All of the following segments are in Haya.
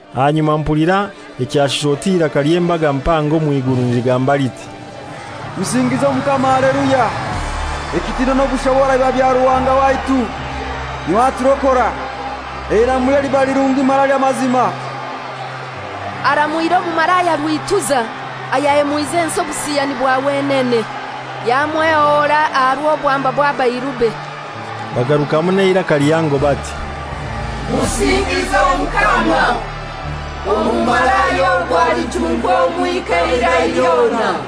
Ahanyuma mpulira ekyashusha oti iraka ly'embaga mpango omw'iguru niligamba liti, «Musingize Omukama Haleluya! Ekitinwa n'obushobora biba bya Ruhanga waitu, n'iwe aturokora. Eiramulye liba lirungi mara ly'amazima. Aramwire omumalaya rwituza; ayahemwize ensi obusiyani bwa wenene. Yamwehora aha rw'obwamba bw'abairube.» Bagarukamu n'eiraka lihango bati, «Musingize Omukama! Omumalaya ogwo alichunkwa omwika eirai lyona.»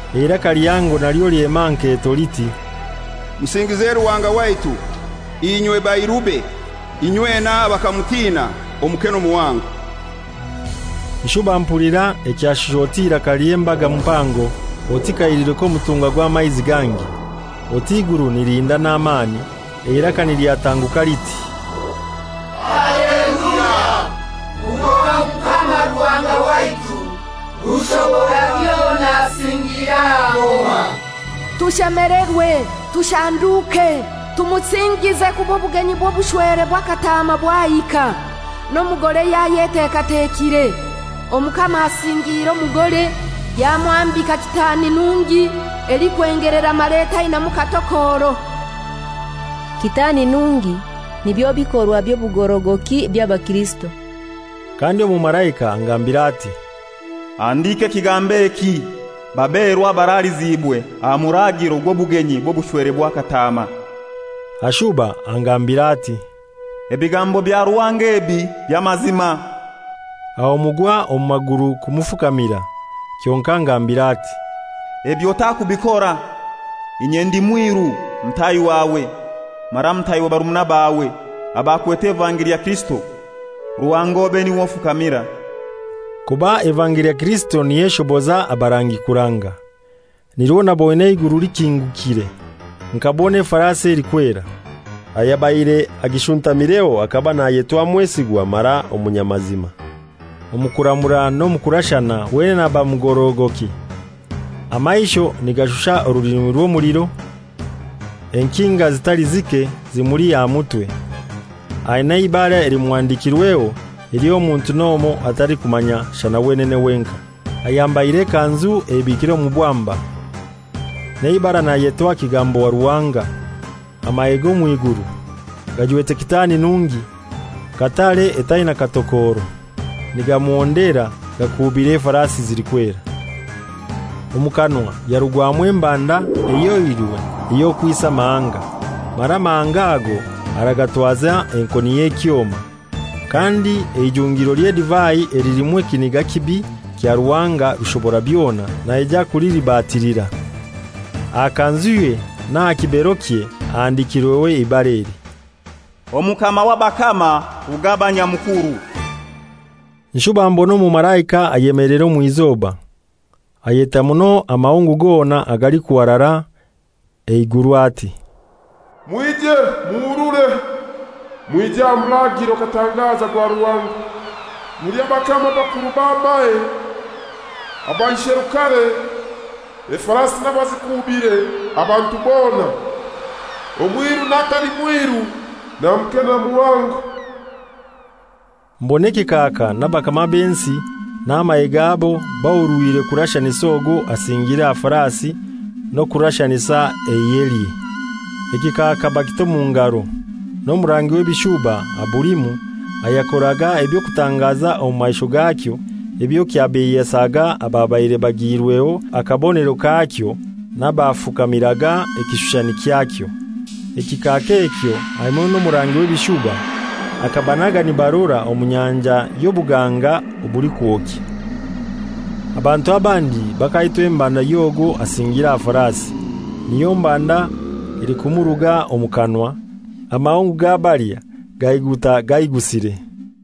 Eiraka lihango nalyo lyema aha nketo liti, «Musingize Ruhanga waitu, inywe bairube inywena abakamutina, omuke n'omuhango.» Nshuba mpulira ekyashusha oti iraka ly'embaga mpango, oti kahiliro k'omutunga, gangi, oti iguru nilihinda n'amani, eiraka nilyatanguka liti, «Haleluya! Kuba Omukama Ruhanga waitu Rushoborabyona asingiire aha ngoma. Tushemelerwe, tushanduke, tumusingize, kuba obugenyi bw'obushwere bwa Kataama bwahika, n'omugore yayetekatekire, Omukama asingiire omugore, yamwambika kitaani nungi, elikwengelera mara etainaimu katokoro.» Kitani nungi nibyo bikorwa by'obugorogoki eby'abakirisito. Kandi omumalaika angambira ati, «Handika ekigambo eki: Baberwa abaraliziibwe aha muraagiro gw'obugenyi bw'obushwere bwa Kataama.» Ashuba angambira ati, «Ebigambo bya Ruhanga ebi by'amazima.» Aho mugwa omu maguru kumufukamira, kyonkai angambira ati, «Ebi otakubikora! Inye ndi mwiru mutahi wawe mara mutaahi wa barumuna bawe abakwete evangeli ya Kirisito. Ruhanga obe n'iwe ofukamira.» Kuba evangeli ya Kirisito niyo eshoboza abarangi kuranga. Nirwo naboine eiguru likingukire, nkabona efarasi elikwera. Ayabaire agishuntamireho akaba nayetwa Mwesigwa mara Omunyamazima, omu kuramura n'omu kurashana wenene aba mugorogoki. Amaisho nigashusha orulimi rw'omuliro, enkinga zitali zike zimuli aha mutwe; ainai eibara elimuhandikirweho ely'omuntu n'omoi atalikumanya shana wenene wenkai. Ayambaire ekanzu eibikire omu bwamba, n'eibara nayetwa Kigambo wa Ruhanga. Amahe g'omw'iguru, gajwete kitaani nungi, katare etainaimu katokoro, nigamuhondera gakuubire efarasi zilikwera. Omu kanwa yarugwamu embanda ehyoirwe ey'okwisa amahanga, mara amahanga ago aragatwaza enkoni y'ekyoma. Kandi eijungiro ly'edivai elilimu ekiniga kibi kya Ruhanga Rushoborabyona naija kulilibatilira. Aha kanzuye n'aha kiberokye ahandikirweho eibara eli: Omukama w'abakama, Rugaba Nyamukuru. Nshuba mbona omumalaika ayemeleire omw'izoba, ayeta muno amahungu gona agalikuharara eiguru ati, «Mwije, muhurure, mwije aha muraagiro katangaza gwa Ruhanga, mulye abakama, abakuru b'amahe, abaisherukare, efarasi n'abazikuubire, abantu bona: Omwiru n'atali mwiru, na muke na muhango.» Mbona ekikaaka n'abakama b'ensi n'amahe gabo bahurwire kurashanisa ogwo asingiire aha farasi n'okurashanisa eihelye. Ekikaaka bakita omu ngaro, n'omurangi w'ebishuba abulimu ayakoraga eby'okutangaza omu maisho gakyo ebyo kyabeiyesaga ababaire bagiirweho akabonero kakyo n'abafukamiraga ekishushani kyakyo. Ekikaaka ekyo hamoi n'omurangi w'ebishuba akabanaga nibarora omu nyanja y'obuganga obulikwokya. Abantu abandi bakaitwa embanda y'ogwo asingire aha farasi; niyo mbanda elikumuruga omu kanwa; amahungu gabalya gaiguta gaigusire.